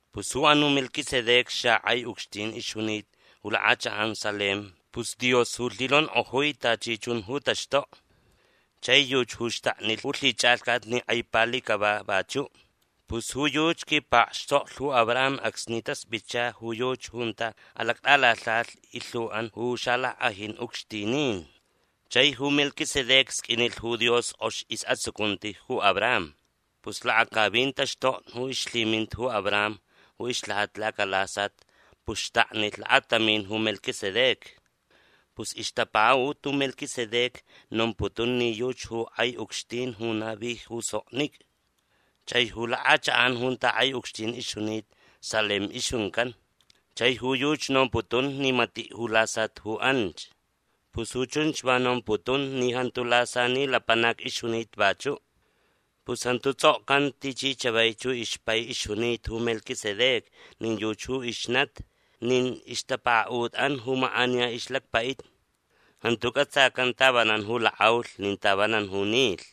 Pus ju anuʼ Melquisedec xakʼai ucxtin ixjunita ju lakʼachakʼan Salem. Pus Dios ju lhinonkʼojui tachi chun ju taxtokni. Chai yuchi ju xtaknilh ju lhichʼalhcat ni kʼai pali cava vachuʼ. Pus ju yuchi quipakxtoklh ju Abraham acsni taspʼitcha ju yuchi junta alactʼalalhajalh ilhuʼan ju xalackʼajin ucxtinin. Chai ju Melquisedec sqʼuinilh ju Dios kʼox isʼatsucunti ju Abraham. Pus lakacavin taxtokni ju ixlhiminta ju Abraham ju ixlhajata lacalasat pus xtaknilh lakatamin ju Melquisedec. Pus ixtapakaʼut ju Melquisedec nomputun ni yuchi ju kʼai ucxtin ju navi ju soknicʼa. Chai ju lakʼachakʼan junta kʼai ucxtin ixjunita Salem ixjuncan. Chai ju yuchi nomputun ni matiʼ ju lasat ju anch. Pus ju chunch va nomputun ni jantu lasani lapanac ixjunita vachuʼ. Pus jantu tsʼokcanta tichi chavaich ju ixpai ixjunita ju Melquisedec nin yuchi ju ixnati nin ixtapakaʼutʼan ju makʼaniya ixlacpai. Jantu cʼatsacan tavanan ju lakʼaulh nin tavanan ju nilh.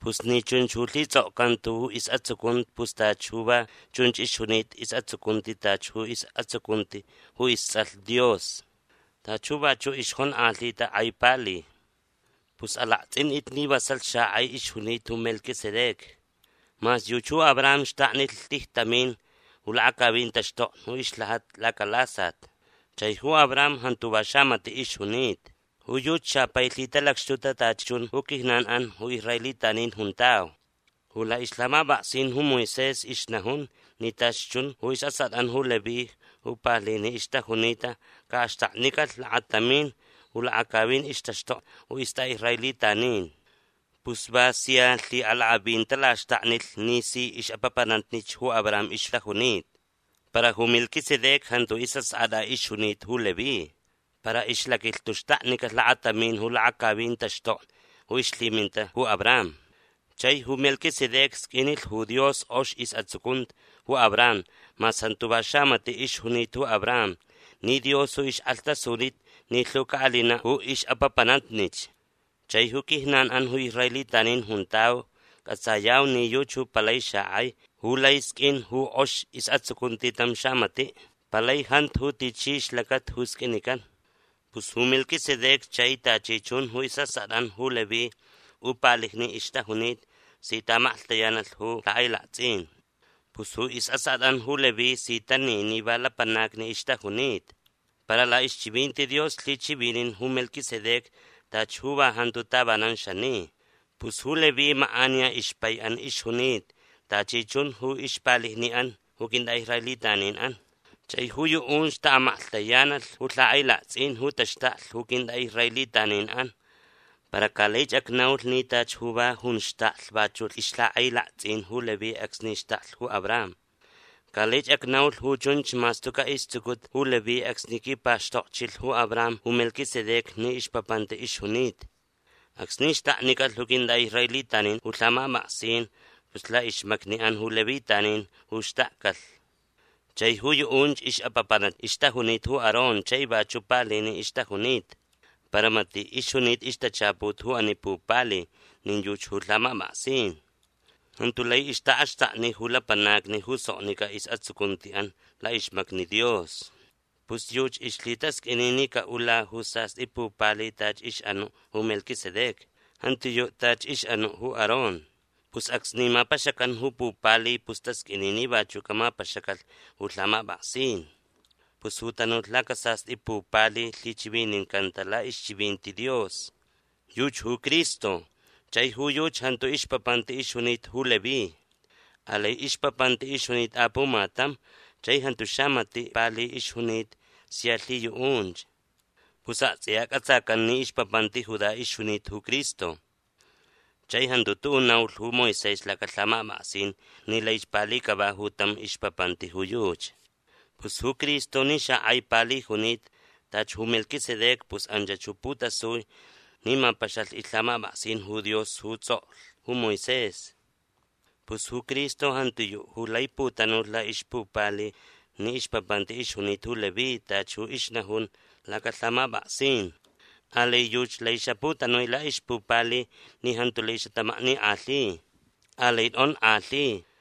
Pus ni chunch ju lhitsʼokcanta ju isʼatsucunti pus tachi ju va chunch ixjunita isʼatsucunti tachi ju isʼatsucunti ju istsʼalh Dios. Tachi ju vachuʼ ixjonkʼalhita kʼai pali. Pus alaktsʼintʼit ni vasalh xakʼai ixjunita ju Melquisedec. Mas yuchi ju Abraham xtaknilh tijtamin ju lakacavin taxtokni ju ixlhajata lacalasat. Chai ju Abraham jantu va xamatiʼ ixjunita. Ju yuchi xapai lhitalacxtuta tachi chun ju quijnanʼan ju israelitanin juntau. Ju laʼixlhamapʼaksin ju Moisés ixnajun ni tachi chun ju isʼaskʼatʼan ju Leví ju palijni ixtajunita caʼaxtaknicalh lakatamin ju lakacavin ixtaxtokni ju istʼaʼisraelitanin. Pus va sia lhiʼalakʼavin talaxtaknilh ni si ixʼapapanatnich ju Abraham ixtajunita. Para ju Melquisedec jantu isʼaskʼatʼa ixjunita ju Leví. Para ixlaquilhtu xtaknicalh lakatamin ju lakacavin taxtokni ju ixlhiminta ju Abraham. Chai ju Melquisedec sqʼuinilh ju Dios kʼox isʼatsucunti ju Abraham mas jantu va xamatiʼ ixjunita ju Abraham ni Dios ju ixkʼalhtasunita ni lhu caʼalinaʼ ju ixʼapapanatnich. Chai ju quijnanʼan ju israelitanin juntau cʼatsayau ni yuchi ju palai xakʼai ju lai sqʼuin ju kʼox isʼatsucunti tam xamatiʼ. Palai jantu ju tichi ixlacata ju sqʼuinican. Pus ju Melquisedec chai tachi chun ju isʼaskʼatʼan ju Leví ju palijni ixtajunita si taʼamaklhtayanalh ju lhakʼailaktsʼin. Pus ju isʼaskʼatʼan ju Leví si tani ni va lapanacni ixtajunita. Para laʼixchivinti Dios lhichivinin ju Melquisedec tachi ju va jantu tavanan xani. Pus ju Leví makʼaniya ixpaiʼan ixjunita tachi chun ju ixpalijniʼan ju quintʼaʼisraelitaninʼan. Chai ju yuʼunch taʼamaklhtayanalh ju lhakʼailaktsʼin ju taxtaklh ju quintʼaʼisraelitaninʼan. Para ca laich acnaulh ni tachi ju va junch xtaklh vachuʼ ixlhakʼailaktsʼin ju Leví acsni xtaklh ju Abraham. Ca laich acnaulh ju chunch mas tucaʼ istsucuta ju Leví acsni quipakxtokchilh ju Abraham ju Melquisedec ni ixpapanti ixjunita. Acsni axtaknicalh ju quintʼaʼisraelitanin ju lhamapʼaksin pus laʼixmacniʼan ju levitanin ju xtakcalh. Chai ju yuʼunch ixʼapapanatnich ixtajunita ju Aarón chai vachuʼ palijni ixtajunita. Para matiʼ ixjunita ixtachaput ju ani pupali nin yuchi ju lhamapʼaksin. Jantu lai ixtaʼaxtakni ju lapanacni ju soknicʼa isʼatsucuntiʼan laʼixmacni Dios. Pus yuchi ixlhitasqʼuini ni caʼula ju sastʼi pupali tachi ixʼanuʼ ju Melquisedec. Jantiyuʼ tachi ixʼanuʼ ju Aarón. Pus acsni mapaxacan ju pupali pus tasqʼuini ni vachuʼ camapaxacalh ju lhamapʼaksin. Pus ju tanulh lacasastʼi pupali lhichivinincanta laʼixchivinti Dios. Yuchi ju Cristo. Chai ju yuchi jantu ixpapanti ixjunita ju Leví. Alai ixpapanti ixjunita apumatam chai jantu xamatiʼ pali ixjunita sia lhiyuʼunch. Pus aktsʼiya cʼatsacan ni ixpapanti Judá ixjunita ju Cristo. Chai jantu tuʼuʼ naulh ju Moisés lacalhamapʼaksin ni laich pali cava ju tam ixpapanti ju yuchi. Pus ju Cristo ni xakʼai pali junita tachi ju Melquisedec pus anchach ju putasui ni mapaxalh ixlhamapʼaksin ju Dios ju tsʼoklh ju Moisés. Pus ju Cristo jantiyuʼ ju lai putanulh laʼixpupali ni ixpapanti ixjunita ju Leví tachi ju ixnajun lacalhamapʼaksin. Alai yuchi lai xaputanui laʼixpupali ni jantu lai xatamaknikʼalhi. Alai tʼonkʼalhi.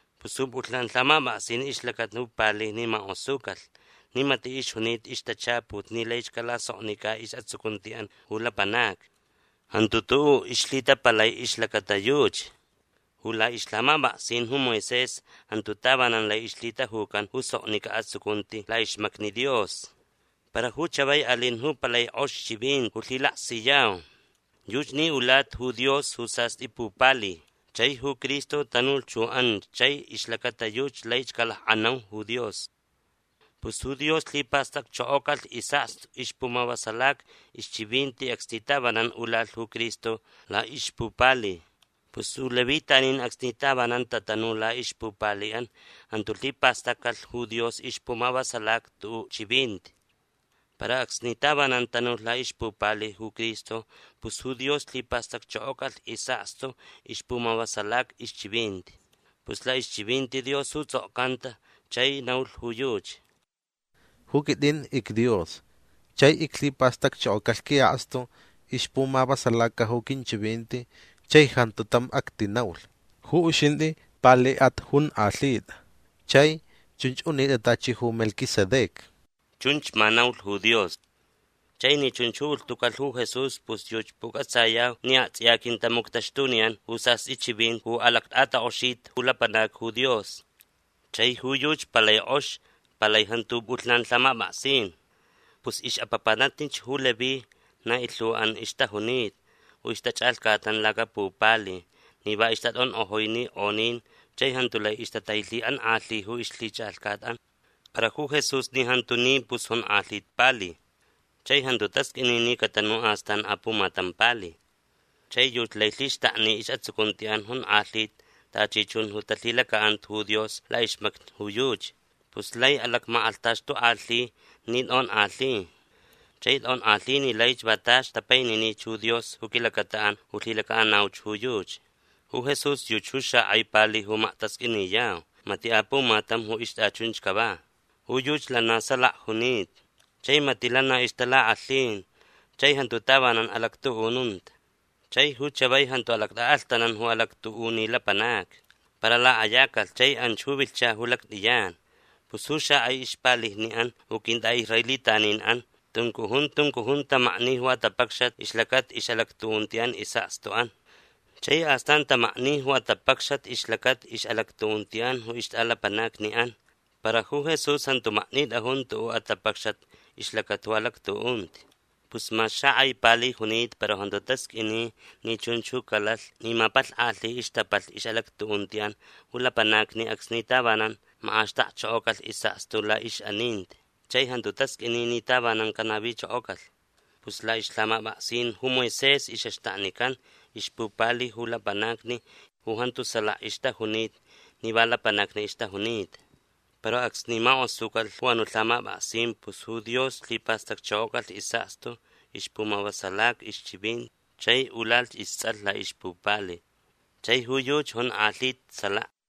Pus ju pʼulhnan lhamapʼaksin ixlacata ju palijni makʼosucalh ni matiʼ ixjunita ixtachaput ni laich calasoknicʼa isʼatsucuntiʼan ju lapanacni. Jantu tuʼuʼ ixlhitapalai ixlacata yuchi. Ju laʼixlhamapʼaksin ju Moisés jantu tavanan lai ixlhitajucan ju soknicʼa atsucunti laʼixmacni Dios. Para ju chavai alin ju palai kʼox chivinti ju lhilaksiyau. Yuchi ni ulata ju Dios ju sastʼi pupali. Chai ju Cristo tanulh ju anch chai ixlacata yuchi laich calakʼanau ju Dios. Pus ju Dios lhipastacchokocalh isʼakstu ixpumavasalaca ixchivinti acsni tavanan ulalh ju Cristo laʼixpupali. Pus ju levitanin acsni tavanan tatanu laʼixpupaliʼan jantu lhipastaccalh ju Dios ixpumavasalaca tuʼuʼ chivinti. Para acsni tavanan tanulh laʼixpupali ju Cristo pus ju Dios lhipastacchokocalh isʼakstu ixpumavasalaca ixchivinti. Pus laʼixchivinti Dios ju tsʼokcanta chani naulh ju yuchi: Ju quitʼin icDios chai iclhipastacchokocalh quiʼakstu ixpumavasalaca ju quinchivinti chai jantu tam actinaulh. Ju uxintʼi paliʼat onkʼalhitʼa Chai chunch unitʼa tachi ju Melquisedec. Chunch ma naulh ju Dios. Chai ni chunch ju ulhtucalh ju Jesús pus yuchi pucʼatsayau ni aktsʼiya aquintamuctaxtuniyan ju sastʼi chivinti ju alactʼatakʼoxita ju lapanacni ju Dios. Chai ju yuchi palai kʼox. Palai jantu ju pʼulhnan lhamapʼaksin. Pus ixʼapapanatnich ju Leví na ilhuʼan ixtajunita ju ixtachʼalhcatnan lacapupali ni va ixtatʼankʼojui ninkʼonin chai jantu lai ixtatailhiʼankʼalhi ju ixlhichʼalhcatʼan. Para ju Jesús ni jantu ni pus jonkʼalhita pali. Chai jantu tasqʼuini ni catanu astan apumatam pali. Chai yuchi lai lhixtakni isʼatsucuntiʼan jonkʼalhita tachi chun ju talhilacaʼanta ju Dios laʼixmacni ju yuchi. Pus lai alacmakʼalhtaxtukʼalhi ni tʼonkʼalhi. Chai tʼonkʼalhi ni laich va tachi tapaininich ju Dios ju quilacataʼan ju lhilacaʼanauch ju yuchi. Ju Jesús yuchi ju xakʼai pali ju maktasqʼuiniyau. Matiʼ apumatam ju ixtʼachunch cava. Ju yuchi lana na salaka junita. Chai matiʼ lana ixtalakʼalhin. Chai jantu tavanan alactuʼununta. Chai ju chavai jantu alactʼaʼalhtanan ju alactuʼuni lapanacni. Para lakʼayacalh chai anch ju vilhcha ju lactʼiyan. Pus ju xakʼai ixpalijniʼan ju quintʼaʼisraelitaninʼan tuncujun tuncujun tamakni ju atapacxat ixlacata ixʼalactuʼuntiʼan isʼakstuʼan. Chai astan tamakni ju atapacxat ixlacata ixʼalactuʼuntiʼan ju ixtʼalapanacniʼan. Para ju Jesús jantu maknitʼajun tuʼuʼ atapacxat ixlacata ju alactuʼunti. Pus mas xakʼai pali junita para jantu tasqʼuini ni chunch ju calalh ni mapalhkʼalhi ixtapalh ixʼalactuʼuntiʼan ju lapanacni acsni tavanan makʼaxtakchokocalh isʼakstu laʼixʼaninti. Chai jantu tasqʼuini ni tavanan canavichokocalh. Pus laʼixlhamapʼaksin ju Moisés ixʼaxtaknican ixpupali ju lapanacni ju jantu salaka ixtajunita ni va lapanacni ixtajunita. Para acsni makʼosucalh ju anuʼ lhamapʼaksin pus ju Dios lhipastacchokocalh isʼakstu ixpumavasalaca ixchivinti chai ulalh istsʼalh laʼixpupali. Chai ju yuchi jonkʼalhita salaka.